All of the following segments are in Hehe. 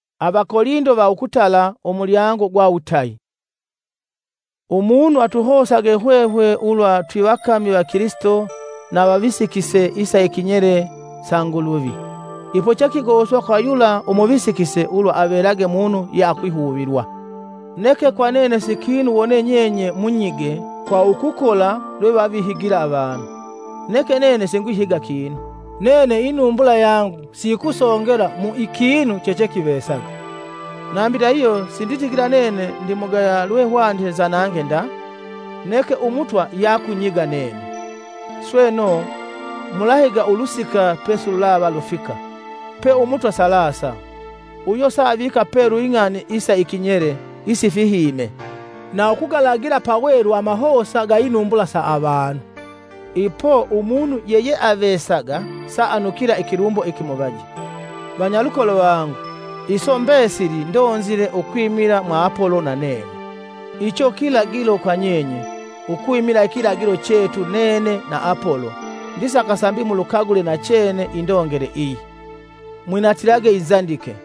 Avigendo va Kilisito. Umunu atuhosage hwehwe ulwa twivakami va Kilisito na avavisikise isa ikinyele sa Nguluvi. Ipo chekigoswa kwa yula umuvisikise ulwa avelage munu yeakwihuvilwa. Neke kwa nene si kinu wone nyenye munyige kwa ukukola lwevavihiga avanu, neke nene singwihiga kinu. Nene inumbula yangu siyikusongela kwa ikinu chechekivesaga, nambi ndahihyo sinditigila nene ndimugaya lwehwanite nzanange nda. Neke Umutwa yakunyiga nene. Sweno, mulahiga ulusika pesilulava lufika, pa Umutwa salasa. Uyo saavika pelu ing'ani isa ikinyele isifihime, na ukugalagila pelu amahosa ga inumbula sa avanu. Ipo umunu yeyeavesaga saanukila ikilumbo ikimuvaje. Vanyalukolo vangu, iso mbesili ndonzile ukwimila mwa Apolo na nene, icho kilagilo kwa nyenye, ukwimila ikilagilo chetu nene na Apolo ndisaka sambi mulukagule nachene indongele iyi, “Mwinatilage inzandike.”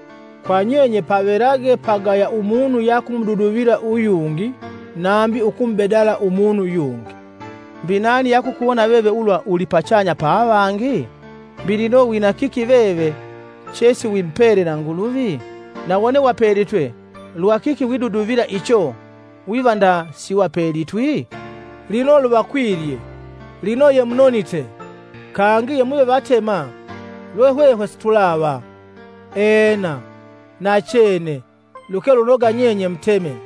Kwa nyenye pavelage pagaya umunu yakumududuvila uyungi nambi ukumubedala umunu yungi. Mbi nani yakukuwona veve ulwa uli pachanya ya avangi? Mbi lino wina kiki veve chesiwimupele na Nguluvi? Na wone wapelitwe, lwakiki widuduvila icho wiva nda siwapelitwi? Lino luvakwilye! Lino yemunonite! Kangi yemuve vatema lwe hwehwe situlava! Ena, nachene, luke lunoga nyenye muteme,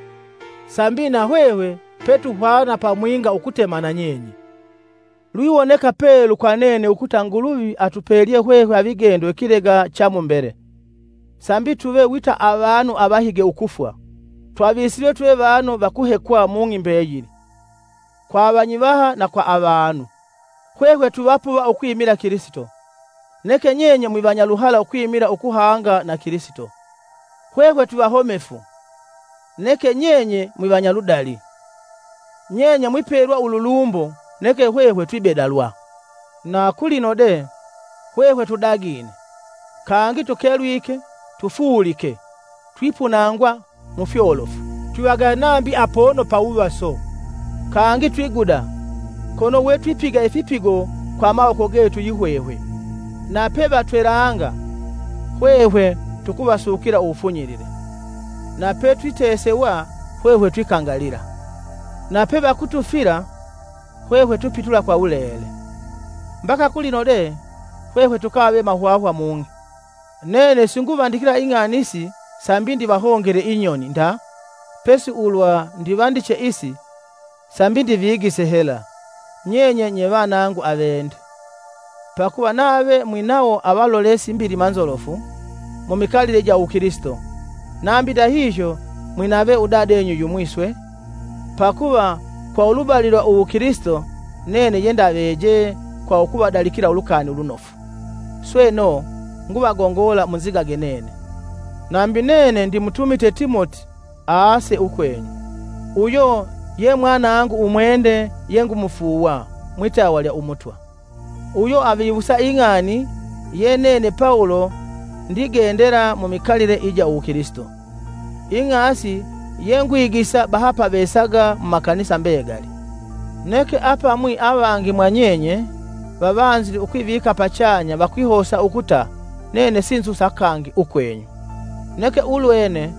sambi na hwehwe petuhwana pamwinga ukutema nanyenye. Lwiwoneka pelu kwa nene ukuta Nguluvi atupelye hwehwe avigendo ikilega cha mu mbele, sambi tuve wita avanu avahige ukufwa, twavisilwe tuve vanu va kuhekwa mung'i mbeyili, kwa avanyivaha na kwa avanu. Hwehwe twivapuva ukwimila Kilisito, neke nyenye mwivanyaluhala ukwimila ukuhanga na Kilisito, hwehwe twivahomefu, neke nyenye mwavanyaludali. Nyenye mwipelwa ululumbo neke hwehwe twibedalwa. Na kulino de, hwehwe tudagine, kangi tukelwike, tufuulike, twipunangwa mufyolofu, twivagaya nambi pono pa wuvaso. Kangi twiguda, kono we twipiga ifipigo kwa amawoko getu yihwehwe. Na pevatwelanga, hwehwe tukuvasukila uwufunyilile, na petwitesewa, hwehwe twikangalila; na pevakutufila, hwehwe twipitula kwa wulele, mbaka kulino de, hwehwe tukave mahwahwa mung'i. Nene singuvandikila ing'ani isi sambi ndivahongele inyoni nda, pesi ulwa ndivandiche isi, sambi ndivigise hela, nyenye nye vanangu avende. Pakuva nave mwinawo avalolesi mbilima nzolofu mumikalile ija uwukilisito, nambi ndahihyo mwinave udadenyu yumwi swe, pakuva kwa ulubali lwa uwukilisito nene yendavejee kwa ukuvadalikila Ulukani Ulunofu. Sweno, nguvagongola munzigage nene. Nambi nene ndimutumite Timoti aase ukwenyu. Uyo ye mwanangu umwende yengumufuuwa mwitawa lya Umutwa. Uyo aviwusa ing'asi ye nene Pawulo ndigendela mumikalile ija uwukilisito; ing'asi yengwigisa bahapavesaga mumakanisa mbegali. Neke apamwi avangi mwa nyenye, vavanzile ukwivika pachanya vakwihosa ukuta nene sinzusa kangi ukwenyu. Neke, ulwene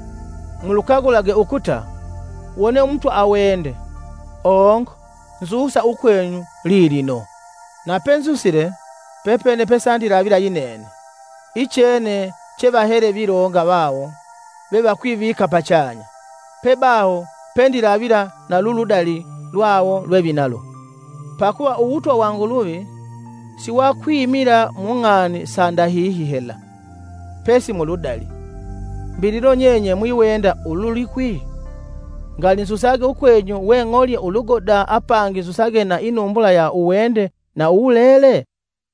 mulukagulage ukuta, wone Umutwa awende, ongo nzusa ukwenyu lilino, napenzusile, pepene pesandilavila yinene, ichene chevahele vilonga vawo vevakwivika pachanya, pebaho pendilavila na luludali lwawo lwevinalo. Pakuva uwutwa wa Nguluvi, siwakwimila mung'ani sa ndahihi hela, pesi muludali. Mbi lino nyenye mwiwenda ululikwi? Ngali nzusage ukwenyu weng'olye ulugoda, apangi nzusage na inumbula iya uwende na uwulele?